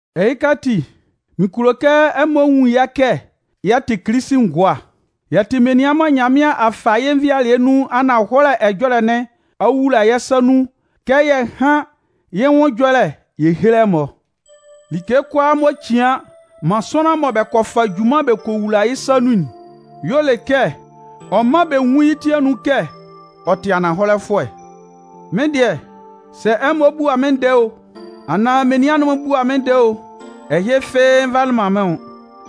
Ɛhɩka ati, mɩn kulo kɛ ɛmɔ nwun yɛ́ kɛ yɛ tɩ Kilisi ngʋa, yɛ tɩ menian mɔ Nyanmɩan a fa yɩ́ nvɩalɩɛ nun ananhɔlɛ ɛjɔlɛ'n ɔ'a wula yɛ́ sa nun kɛ yɛ hán yɩ́ nwʋn ɛjɔlɛ yɛ héle ɛmɔ. Like kʋalaa m'ɔ cian man sʋanlan mɔ bɛ kɔ fa junman bɛ kɔ wula yɩ́ sa nun'n y'ɔ le kɛ ɔ mán bɛ nwún yɩ́ ti anun kɛ ɔ tɩ ananhɔlɛfʋɛ. Mɩ́n dɩɛ, sɛ ɛmɔ bua mɩ́n ndɛɛ o, anaan menian'n-mɔ bua mɩ́n ndɛɛ o, ɛhɩ fɩ́ɩ́ nvalɩ man mɩ́n nwʋn.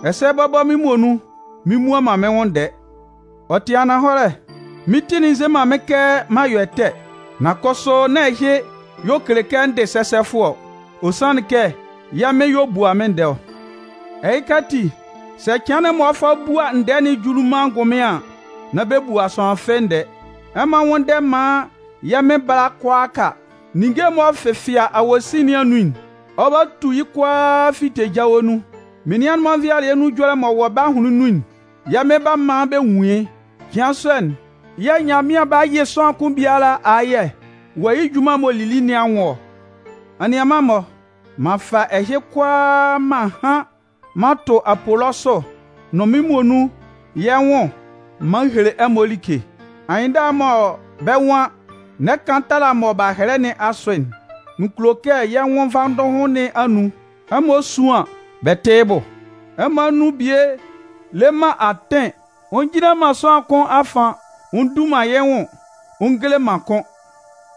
Ɛsɛ bɔbɔ, mɩ́n muonun mɩn mmua man mɩ́n nwʋn ndɛɛ Ɔ tɩ ananhɔlɛ, mɩ́n ti'n nze man mɩ́n kɛ m'an yɔ ɛtɛ. Nan kʋsʋ nán ɛhɩ y'ɔ kele kɛ n dɩ sɛsɛfʋɛ ɔ. Ɔ sanlɩn kɛ yɛ́ Mɩn y'ɔ bua mɩ́n ndɛɛ ɔ. Ɛhɩka ati, sɛ cɩan'n m'ɔ 'fa bua ndɛɛ'n juli man angʋnmɩan an, nán bɛ bua sʋanlan fɩ́ɩ́ ndɛɛ. Ɛmɔ nwʋ́nndɛ maan yɛ́ Mɩn bála kʋalaaka. Ninnge m'ɔ fɛfɩa awosin nɩn anun'n, ɔ 'ba tu yɩ́ kʋalaa fite jawe nun. Menian'n-mɔ nvɩalɩɛ nun ɛjɔlɛ m'ɔ wɔ bɛ́ ahʋnlɩn nun'n, yɛ́ Mɩn 'ba man bɛ nwun yɩ́. Cɩan sɔ'n yɛ̂ Nyanmɩan 'ba yɩ sʋanlan kʋn biala ayɛ wɔ yɩ́ junman'n m'ɔ lili nɩn anwʋn ɔ. Anianman-mɔ, m'an fa ɛhɩ kʋalaa mɔ m'an han'n m'an tʋ Apolɔsʋ nʋn mɩ́n muonun yɛ́ nwʋn m'an hele ɛmɔ like. Anyɩnndala'n mɔ bɛ́ nwan: “N'ɛ kan tala mɔ b'a hɛlɛ nɩn asʋ'n”, mɩn kulo kɛ yɛ́ nwʋn nvandʋhʋn nɩn anun, ɛmɔ suan bɛ tɩ yɩ́ bʋ. Ɛmɔ anun bie le man atɩn ɔ njinlan man sʋanlan kʋn afan ɔ ndu man yɩ́ nwʋn ɔ ngele man kʋn.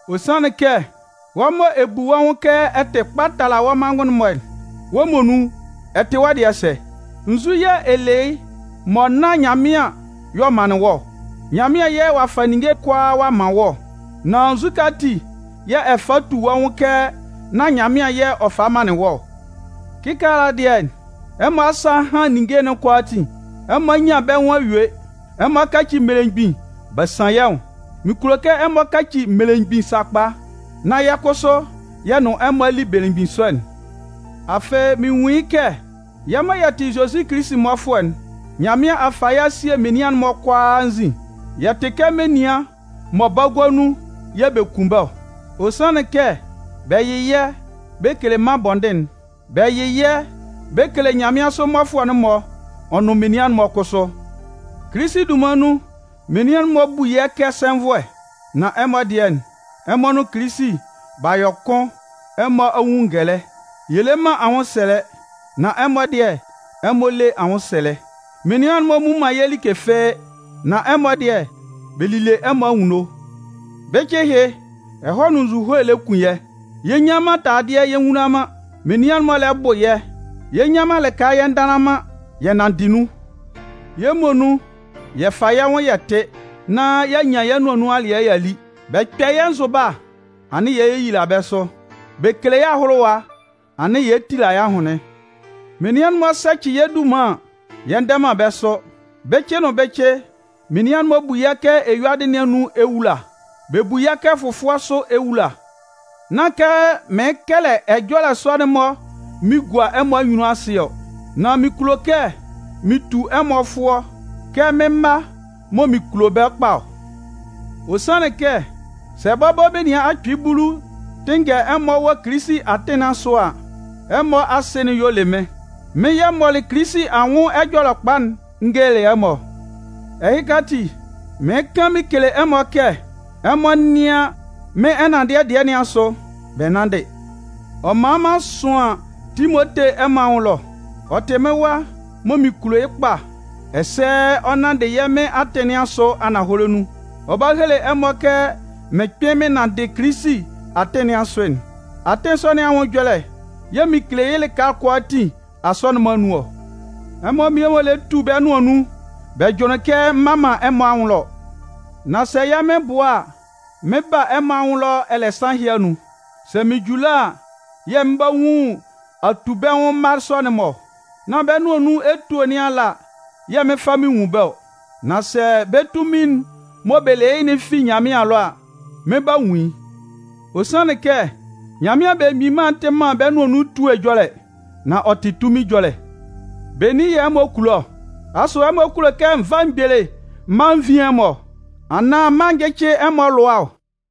Ɔ sanlɩn kɛ wɔ́ mɔ ɛ bu wɔ́ nwʋn kɛ ɛ tɩ kpa tala wɔ́ manngʋn'n-mɔ'n, wɔ́ muonun ɛ tɩ wɔ́ dɩɛ sɛ? Nzu yɛ̂ ɛ le yɩ́ mɔ nán Nyanmɩan y'ɔ manlɩn wɔ́ ɔ? Nyanmɩan yɛ̂ ɔ'a fa ninnge kʋalaa ɔ'a man wɔ́ ɔ, nan nzukɛ ati yɛ̂ ɛ fa tu wɔ́ nwʋn kɛ nán Nyanmɩan yɛ̂ ɔ falɩ manlɩn wɔ́ ɔ? Kɩkaala dɩɛ, ɛmɔ asa a han ninnge'n kʋalaatin. Ɛmɔ a nyan bɛ́ nwʋn a yue. Ɛmɔ a kaci mmelemgbin b'a san yɛ́ nwʋn. Mɩn kulo kɛ ɛmɔ kaci mmelemgbin sakpa, nán yɛ́ kʋsʋ yɛ nʋn ɛmɔ a li belemgbin sɔ'n. Afɩ, mɩn nwun yɩ́ kɛ yɛ́ mɔ yɛ tɩ Zozi Kilisi mmɔfʋɛ'n, Nyanmɩan a fa yɛ́ a sie menian'n-mɔ kʋalaa anzin. Yɛ tɩ kɛ menian mɔ bagua nun yɛ̂ bɛ kun bɛ́ ɔ. Ɔ sanlɩn kɛ bɛ yɩ yɛ́ bɛ kele mân bɔndɩn'n, bɛ yɩ yɛ́ bɛ kele nyanmɩansʋ mmɔfʋɛ'n-mɔ ɔ nʋn menian'n-mɔ kʋsʋ. Kilisi dunman nun, menian'n-mɔ bu yɛ́ kɛ sɛnvʋɛ. Nan ɛmɔ dɩɛ, ɛmɔ nʋn Kilisi b'a yɔ kʋn ɛmɔ a nwun ngɛlɛ. Yɛ le man anwʋnsɛlɛ, nan ɛmɔ dɩɛ, ɛmɔ le anwʋnsɛlɛ. Menian'n-mɔ mmu man yɛ́ like fɩ́ɩ́, nan ɛmɔ dɩɛ, bɛ lile ɛmɔ anwunno. Bɩcɩ ɛhɩ, ɛhɔɛ nʋn nzuhoe lɛ kun yɛ́, yɛ nnyan man taladɩɛ yɛ nwula man. Menian'n-mɔ lɛ bʋ yɛ́. Yɛ nnyan man lɩka yɛ ndanlan man, yɛ nanndɩ nun. Yɛ́ muonun yɛ fa yɛ́ nwʋn yɛ tɩ, nán y'a nyan yɛ́ nʋan nun alɩɛ y'a li. Bɛ 'kpɛ yɛ́ nzʋba a, anɩn yɛ lɛ yeyila bɛ́ sʋ. Bɛ 'kele yɛ́ ahʋlʋwa a, anɩn yɛ lɛ tila yɛ́ ahʋnlɩn. Menian'n-mɔ 'sɛcɩ yɛ́ dunman an, yɛ ndɛ man bɛ́ sʋ. Bɩcɩ nʋn bɩcɩ, menian'n-mɔ bu yɛ́ kɛ eyuadɩ nɩn anun ewula. Bɛ bu yɛ́ kɛ fʋfʋɛ sʋ ewula. Nán kɛ mɩɩn kɛlɛ ɛjɔlɛ sɔ'n-mɔ mɩn gua ɛmɔ anyunnun asɩ ɔ. Nan mɩn kulo kɛ mɩn tu ɛmɔ fʋɔ kɛ mɩ́n mma mɔ mɩn kulo bɛ́ kpa ɔ. Ɔ sanlɩn kɛ, sɛ bɔbɔ menian akpɩɩ bulu tɩnngɛ ɛmɔ wɔ Kilisi atɩn nɩn asʋ a, ɛmɔ asɩ'n y'ɔ le mɩ́n. Mɩ́n yɛ̂ m mɔlɩ Kilisi anwʋn Ɛjɔlɛkpa'n n gelelɩ ɛmɔ ɔ. Ɛhɩka ati, mɩɩn kan mɩn kele ɛmɔ kɛ ɛmɔ nɩ́an mɩ́n ɛnanndɩɛ dɩɛ nɩn asʋ, bɛ nánndɩ. Ɔ man m'an sʋan Timote ɛmɔ anwʋn ɛlɔ. Ɔ tɩ mɩ́n wa mɔ mɩn kulo yɩ́ kpa ɛsɛ ɔ nanndɩ yɛ́ Mɩn atɩn nɩn asʋ ananhɔlɛ nun. Ɔ 'ba hele ɛmɔ kɛ mɩn kpɩn mɩn nanndɩ Kilisi atɩn nɩn asʋ'n. Atɩn sɔ nɩn anwʋn ɛjɔlɛ yɛ̂ mɩn kele yɩ́ lɩka kʋalaatin Asɔnɩn'n-mɔ anun ɔ. Ɛmɔ mmie-mɔ lɛ tu bɛ́ nʋan nun, bɛ jʋnlɩn kɛ m mma man ɛmɔ anwʋn ɛlɔ. Nan sɛ yɛ́ Mɩn bʋa a, mɩn 'ba a ɛmɔ anwʋn ɛlɔ ɛlɛ nsan ɛhɩ anun. Sɛ mɩn ju ɛlɔ a, yɛ̂ mɩn 'ba nwun atubɛnwʋn mma sɔ'n-mɔ ɔ. Nán bɛ́ nʋan nun etue nɩn ala yɛ̂ mɩn 'fa mɩn nwun bɛ́ ɔ. Nan sɛ bɛ́ tunmin'n mɔ bɛ le yɩ́'n fi Nyanmɩan ɛlɔ a, mɩn 'ba nwun yɩ́. Ɔ sanlɩn kɛ, Nyanmɩan Belemgbin Mân'n tɩ man bɛ́ nʋan nun etue ɛjɔlɛ, nan ɔ tɩ tunmin ɛjɔlɛ. Benin yɛ̂ ɛmɔ kulo ɔ? Asʋ ɛmɔ kulo kɛ n vá mgbele m mála n vín ɛmɔ, anaan m mála n jɩ́cɩ ɛmɔ alʋa ɔ?